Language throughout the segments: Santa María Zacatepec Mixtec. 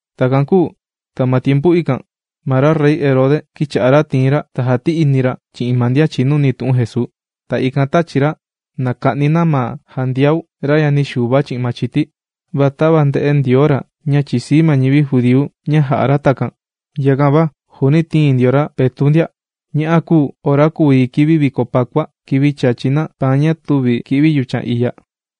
Takan kūu ta ma tiempu ikan ma ra Rey Herode kīcha'a ra tìin ra ta jàti'ini ra chi'in ma ndian chìnuni tu'un Jesuu. Ta ikan tāchi ra na kuka'ni na ma Jandiau, ra yani Xuva chi'in machiti. Va tava ndē'e ndio ra ña chìsii ma ñivi judíu ña jà'a ra takan, yakan va juuni tīin ndio ra Petu' ndia. Ña'a kūu ora kùu yi kivi viko pakua, kivi chàchi na paan ña tüvi kì'vi yuchan iya.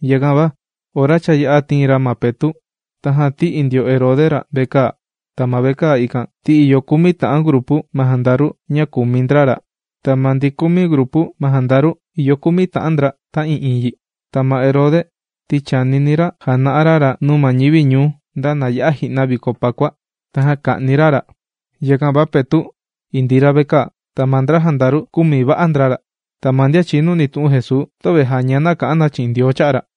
Yakan va ora cha yā'a tìin ra ma Petu', tajan tī'i ndio Herode ra vekaa. Ta ma vekaa ikan, ti ìyo kumi ta'an grupu ma jandaru ña kùmi ndra ra. Ta ma ndi kumi grupu ma jandaru ìyo kumi ta'an ndra ta'ii'iin yi. Ta ma Herode ti chànini ra jana'a ra ra nuu ma ñivi ñuu nda kati ya'a ji'na viko Pakua, tajan ka'ni ra ra. Yakan va Petu' indii ra vekaa, ta ma ndra jandaru kūmi va'a ndra ra. Ta ma ndian chìnuni tu'un Jesuu, töve jàña na kà'an na chi'in Ndioo cha'a' ra.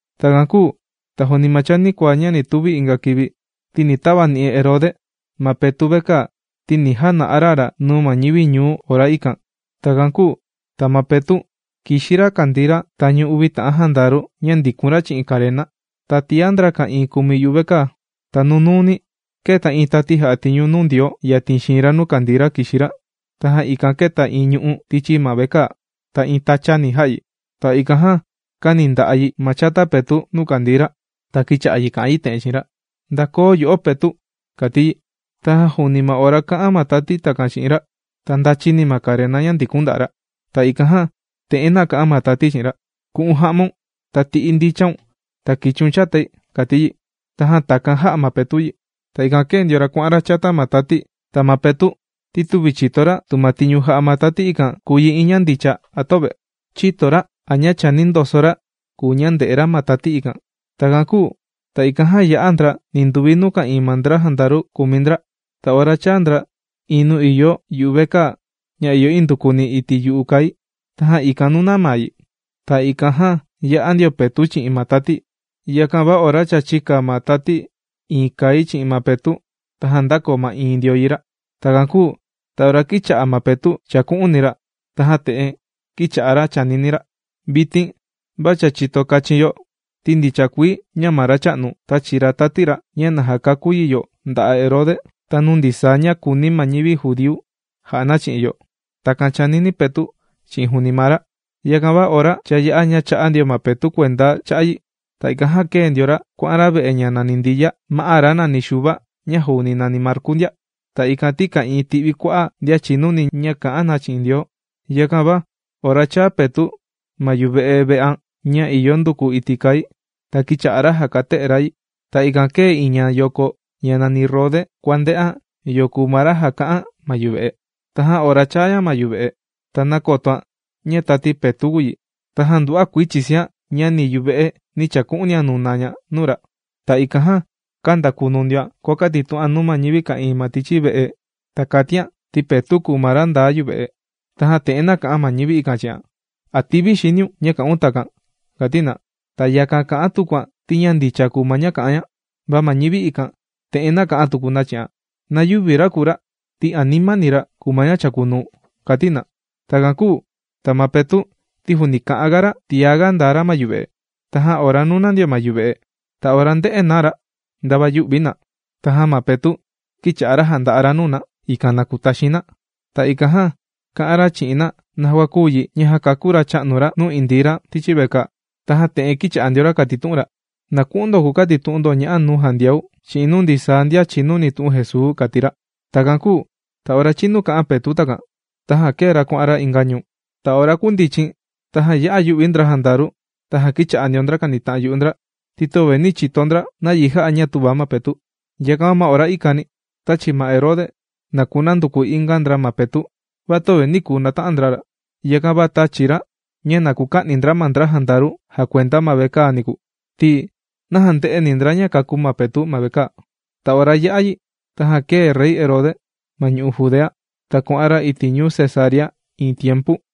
Takan kūu ta juuni ma chanikuaa ña ni tuvi inga kivi, ni tavani'i Herode ma Petu' vekaa ti ni jana'a ra ra nuu ma ñivi ñuu ora ikan. Takan kūu ta ma Petu' kìxi ra kàndii ra tañu uvi ta'an jandaru ña ndikun ra chi'in karena, ta tiá ndra ka'ìin kùmi yuvekaa. Ta nunuuni kēta iin tati jà'a tiñu nuu Ndioo yatin xiin ra nuu kàndii ra kìxi ra. Tajan ikan kēta iin ñu'ú tichi ma vekaa, ta iin tachani jā'a yi. Ta ikan jan kāni nda'a' yi ma chata Petu' nuu kàndii ra. Ta kīcha'a yi kà'an yi te'en chi'in ra: ―¡Ndakoo yo'o, Petu'! ―kàti yi. Tajan juuni ma ora kà'an ma tati takan chi'in ra, ta ndāchi ni ma karena ña ndikun nda'a' ra. Ta ikan jan te'en nāka'an ma tati chi'in ra: ―¡Ku'un ja'maun ta ti'i ndicha cha'un ta kichiun chatai! ―kàti yi. Tajan takan jā'a ma Petu' yi. Ta ikan kēe ndio ra kuà'an ra chata ma tati. Ta ma Petu', ti tüvi chìto ra tu ma tiñu jà'a ma tati ikan kùu yi iin ña ndicha, a töve. Chïto ra a ña chàni ndoso ra kùu ña ndè'e ra ma tati ikan. Takan kūu ta ikan jan yā'a ndra ninduvi nuu ka'ìin ma ndra jandaru kùmi ndra. Ta ora chāa ndra iin nuu ìyo yuvekaa ña ìyo nduku iti' yu'u kai. Tajan ikan nūna maa yi, ta ikan jan yā'a ndio Petu' chi'in ma tati. Yakan va ora cha chīka ma tati iin kai chi'in ma Petu', tajan ndākoo ma'iin ndio yi ra. Takan kūu ta ora kīcha'a ma Petu' chàku'uni ra, tajan te'en kīcha'a ra chànini ra: ―Vitin va cha chìto kachin yo, ti ndicha kuii ña ma Racha'nu, tāchi ra tati ra ña na jakakú yi yo nda'a' Herode ta nuu ndisaa ña kùuni ma ñivi judíu ja'a na chi'o. ―Takan chànini Petu' chi'in juuni maa ra. Yakan va ora cha yā'a ña chā'a ndio ma Petu' kuenda cha'a' yi. Ta ikan jan kēe ndio ra kuà'an ra ve'e ña nàni Ndiya, ma'á ra nàni Xuva ña juuni nàni Marku ndia. Ta ikan ti ka'ìin ti'vi kua'a' ndian chìnuni ña kà'an na chi'in Ndioo. Yakan va ora chāa Petu' ma yuve'e ve'an ña ìyo nduku iti' kai, ta kīcha'a ra jàkate'e ra yi. Ta ikan kēta iin ñayoko ña nàni Rode kuànde'an yo kùu ma ra jàkate'e ma yuve'e. Tajan ora chāa ña ma yuve'e, ta nākotoan ña tati Petu' kùu yi. Tajan nduva'a kuii chìsian ña ni yuve'e nī chaku'unia nuna ña nuu ra. Ta ikan jan kāndakunu ndioan kuàkatitu'an nuu ma ñivi ka'ìin ma tichi ve'e. Ta kàtian ti Petu' kùu ma ra ndaa ma yuve'e. Tajan te'en nāka'an ma ñivi ikan chi'an: ―¿A tìvi xiniun ña kà'un takan? ―kàti na. Ta yakan kà'an tukuan ti ña ndicha kùu ma ña kà'an ña. Va ma ñivi ikan te'en nāka'an tuku na chi'an: ―Na yüvi ra kùu ra ti animani ra kùu ma ña chàkunuu ―kàti na. Takan kūu ta ma Petu' ti juuni kà'an ga ra tiaga ndaa ra ma yuve'e. Tajan ora nūna ndio na ma yuve'e, ta ora ndē'e na ra ndava yū'vi na. Tajan ma Petu' kīcha'a jànda'a ra nuu na, ikan na kutaxin na. Ta ikan jan kā'an ra chi'in na naja kūu yi ña jākakú Racha'nu ra nuu indii ra tichi vekaa. Tajan te'en kīcha'a ndio ra kàtitu'un ra: ―Na ku'un ndo kukatitu'un ndo ña'a nuu Jandiau chi'in nuu ndisaa ndian chìnuni tu'un Jesuu ―kàti ra. Takan kūu ta ora chinu kà'an Petu' takan, tajan kēe ra kuà'an ra inga ñuu. Ta ora kundichin tajan ya'a yū'vi ndra jandaru ta kīcha'a ndio ndra kànita'an yu'u ndra, ti töve nī chito ndra nayi jā'a ña tüva ma Petu'. Yakan va ma ora ikan tāchi ma Herode na kunanduku inga ndra ma Petu'. Va töve nī kuu nata'an ndra ra. Yakan va tāchi ra ña na kuka'ni ndra ma ndra jandaru jàkuenda ma vekaa niku. Ti naja ndë'eni ndra ña kākú ma Petu' ma vekaa. Ta ora yā'a yi tajan kēe Rey Herode ma ñu'u' Judea, ta kuà'an ra iti' ñuu Cesarea iin tiempu.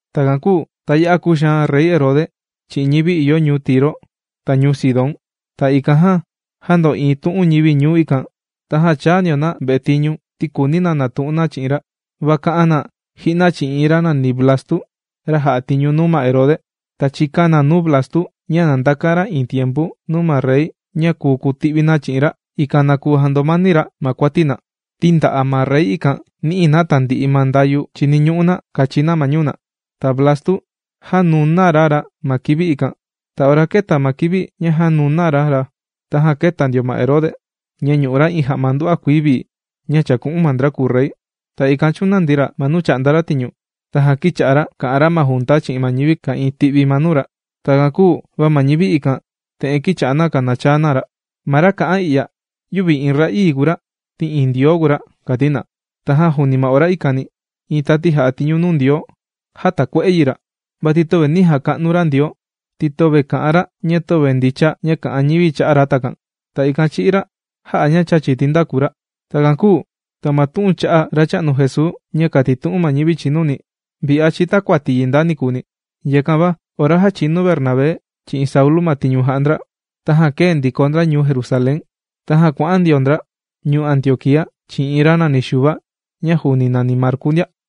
Takan kūu ta ya'a kūxaan Rey Herode chi'in ñivi ìyo ñuu Tiro ta ñuu Sidón. Ta ikan jan jāndo'iin tu'un ñivi ñuu ikan, tajan chāa ndio na vetiñu ti kùuni na natu'un na chi'in ra. Va kā'an na ji'na chi'in iin ra nàni Blastu, ra jà'a tiñu nuu ma Herode. Ta chīka na nuu Blastu ña na ndakan ra iin tiempu nuu ma rey ña kùu kuti'vi na chi'in ra, ikan na kuu jandomani ra ma kuati na, ti nda'a' ma rey ikan nì'i na tandi'i ma ndayu chìniñu'u na kachi na ma ñuu na. Ta Blastu jānuna ra ra ma kivi ikan. Ta ora kēta ma kivi ña jānuna ra ra, tajan kēta ndio ma Herode, ña ñù'u ra iin ja'ma nduva'a kuii vii ña chàku'un ma ndra kùu rey. Ta ikan chūnandi ra ma nuu chà'nda ra tiñu. Tajan kīcha'a ra kà'an ra ma junta chi'in ma ñivi ka'ìin ti'vi ma nuu ra. Takan kūu va ma ñivi ikan, te'en kīcha'a na kànachaa na: ―Ma ra kà'an i'ya yüvi iin ra'ii kùu ra, ti iin ndioo kùu ra ―kàti na. Tajan juuni ma ora ikani iin tati jà'a tiñu nuu Ndioo, jātakue'e yi ra, vati töve nī jaka'nu ra Ndioo ti töve kà'an ra ña töve ndicha ña kà'an ñivi cha'a' ra takan. Ta ikan chī'í ra jā'a ña chàchi tindaku ra. Takan kūu ta ma tu'un cha'a' Racha'nu Jesuu ña kàtitu'un ma ñivi chìnuni, vi'a chìtakuati yi nda nikuuni. Yakan va ora jāchinu Bernabé chi'in Saulu ma tiñu jà'a ndra, tajan kēe ndiko ndra ñuu Jerusalén, tajan kuà'an ndio ndra ñuu Antioquía chi'in iin ra nàni Xuva ña juuni nàni Marku ndia.